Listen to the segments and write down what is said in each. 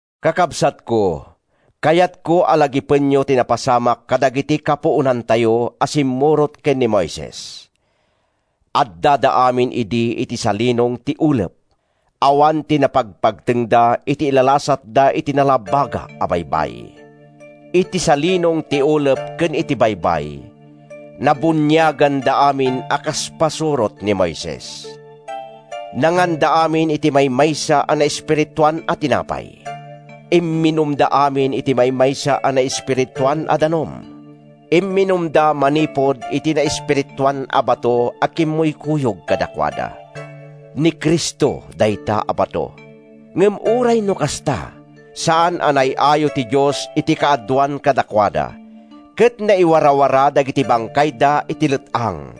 Kakabsatko, kayatko a lagipenyo ti napasamak kadagiti kapuonantayo a simmurot ken ni Moises. Addada amin idi iti salinong ti ulep. Awan ti napagpagtengda iti ilalasatda iti Nalabaga a Baybay. Iti salinong ti ulep ken iti baybay, nabuniaganda amin a kas pasurot ni Moises. Nanganda amin iti maymaysa a naespirituan a tinapay. Imminumda amin iti maymaysa a naespirituan a danum. Imminumda manipud iti naespirituan a bato a kimmuykuyog kadakuada. Ni Cristo dayta a bato. Ngem uray no kasta, saan a naay-ayo ti Dios iti kaaduan kadakuada, ket naiwarawara dagiti bangkayda iti let-ang.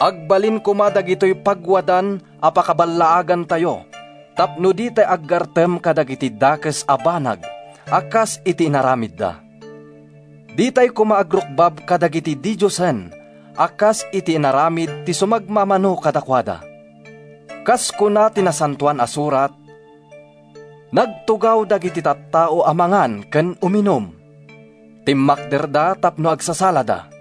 Agbalin koma dagitoy pagwadan a pakaballaagantayo tapno ditay aggartem kadagiti dakes a banag, a kas iti inaramidda. Ditay koma agrukbab kadagiti didiosen, a kas iti inaramid ti sumagmamano kadakuada. Kas kuna ti Nasantoan a Surat: “Nagtugaw dagiti tattao a mangan ken uminum; timmakderda tapno agsasalada.”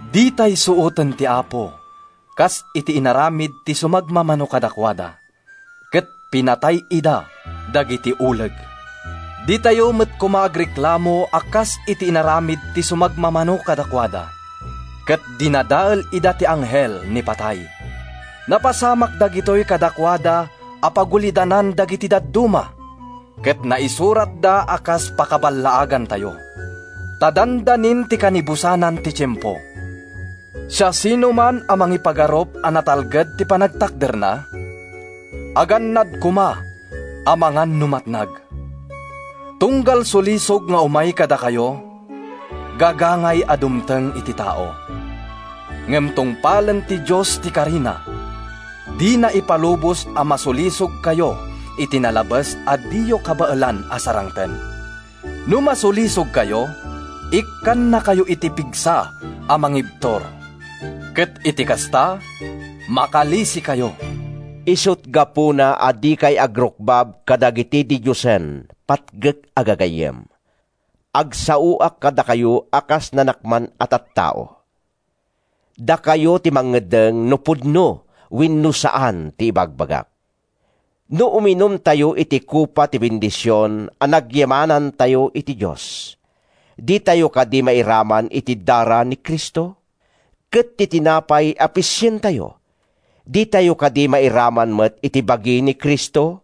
Ditay suoten ti Apo, kas iti inaramid ti sumagmamano kadakuada—ket pinatay ida dagiti uleg. Ditayo met koma agreklamo a kas iti inaramid ti sumagmamano kadakuada—ket dinadael ida ti Anghel ni Patay. Napasamak dagitoy kadakuada a pagulidanan dagiti dadduma, ket naisuratda a kas pakaballaagantayo. Ta dandanin ti kanibusanan ti tiempo. Siasinoman a mangipagarup a natalged ti panagtakderna, agannad koma amangan no matnag. Tunggal sulisog nga umay kadakayo, gagangay a dumteng iti tao. Ngem tungpalen ti Dios ti karina; dina ipalubos a masulisogkayo iti nalabes a diyo kabaelan a sarangten. No masulisogkayo, ikkannakayo iti pigsa a mangibtur, ket iti kasta, makalisikayo. Isut’ gapuna a dikay agrukbab kadagiti didiosen, patgek a gagayyem. Agsaoak kadakayo a kas nanakman a tattao. Dakayo ti mangeddeng no pudno wenno saan ti ibagbagak. No uminumtayo iti kopa ti bendision a nagyamanantayo iti Dios, ditayo kadi mairaman iti dara ni Cristo? Ket ti tinapay a pisientayo, ditayo kadi mairaman met iti bagi ni Cristo?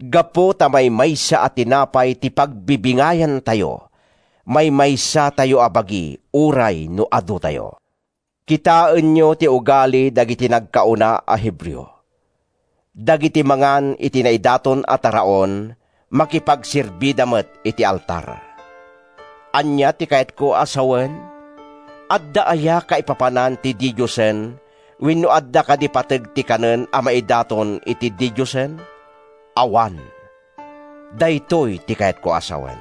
Gapu ta maymaysa a tinapay ti pagbibingayantayo, maymaysatayo a bagi uray no adutayo. Kitaenyo ti ugali dagiti nagkauna a Hebreo; dagiti mangan iti naidaton a taraon, makipagserbida met iti altar. Ania ti kayatko a sawen? Adda aya kaipapanan ti didiosen wenno adda kadi pateg ti kanen a maidaton iti didiosen? Awan! Daytoy ti kayatko a sawen: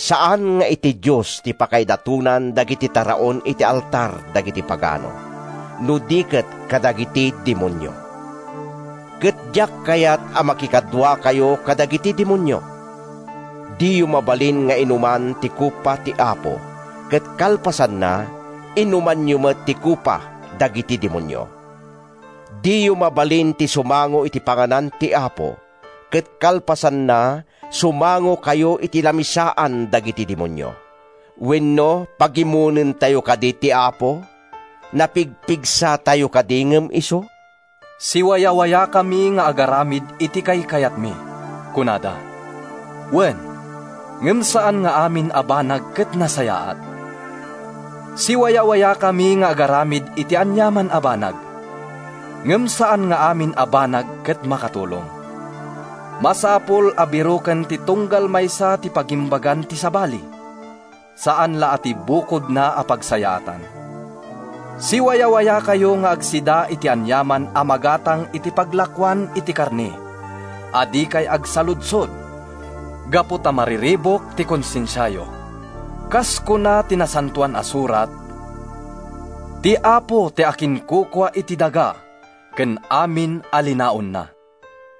Saan nga iti Dios ti pakaidatonan dagiti taraon iti altar dagiti pagano, no di ket kadagiti demonio. Ket diak kayat a makikaduakayo kadagiti demonio. Diyo mabalin nga inuman ti kopa ti Apo ket kalpasanna, inumanyo met ti kopa dagiti demonio. Diyo mabalin ti sumango iti panganan ti Apo ket kalpasanna, sumangokayo iti lamisaan dagiti demonio. Wenno, pagimonentayo kadi ti Apo? Napigpigsatayo kadi ngem isu? “Siwayawayakami nga agaramid iti kaykayatmi,” kunada. Wen, ngem saan nga amin a banag ket nasayaat. “Siwayawayakami nga agaramid iti aniaman a banag”—ngem saan nga amin a banag ket makatulong. Masapul a biroken ti tunggal maysa ti pagimbagan ti sabali, saan la a ti bukodna a pagsayaatan. Siwayawayakayo nga agsida iti aniaman a magatang iti paglakoan iti karne a dikay agsaludsod gapu ta mariribuk ti konsensiayo. Kas kuna ti Nasantoan a Surat: “Ti Apo ti akinkukua iti daga ken amin a linaonna.”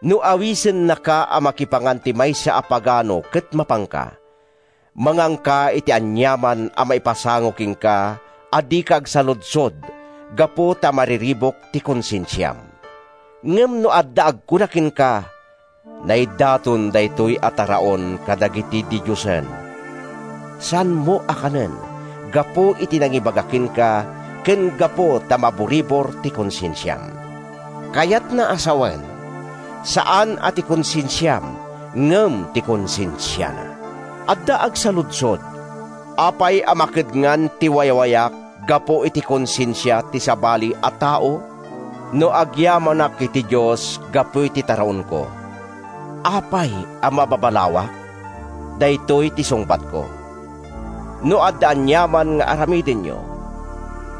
No awisennaka a makipangan ti maysa a pagano ket mapanka, manganka iti aniaman a maipasango kenka a dika agsaludsod gapu ta mariribuk ti konsensiam. Ngem no adda agkuna kenka, “Naidaton daytoy a taraon kadagiti didiosen,” saanmo a kanen gapu iti nangibaga kenka ken gapu ta maburibor ti konsensiam— kayatna a sawen, saan a ti konsensiam, ngem ti konsensiana. Adda agsaludsod, “Apay a makedngan ti wayawayak gapu iti konsensia ti sabali a tao? No agyamanak iti Dios gapu iti taraonko, apay a mababalawak?” Daytoy ti sungbatko: No adda aniaman nga aramidenyo,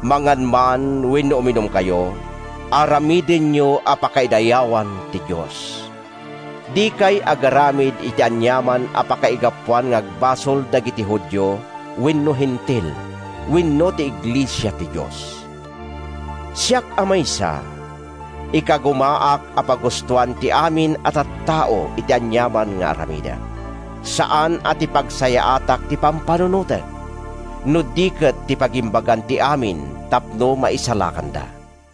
mangan man wenno uminumkayo, aramidenyo a pakaidayawan ti Dios. Dikay agaramid iti aniaman a pakaigapuan nga agbasol dagiti Judio wenno Hentil wenno ti iglesia ti Dios. Siak a maysa, ikagumaak a pagustoan ti amin a tattao iti aniaman nga aramidek. Saan a ti pagsayaatak ti pampanunotek, no di ket ti pagimbagan ti amin tapno maisalakanda.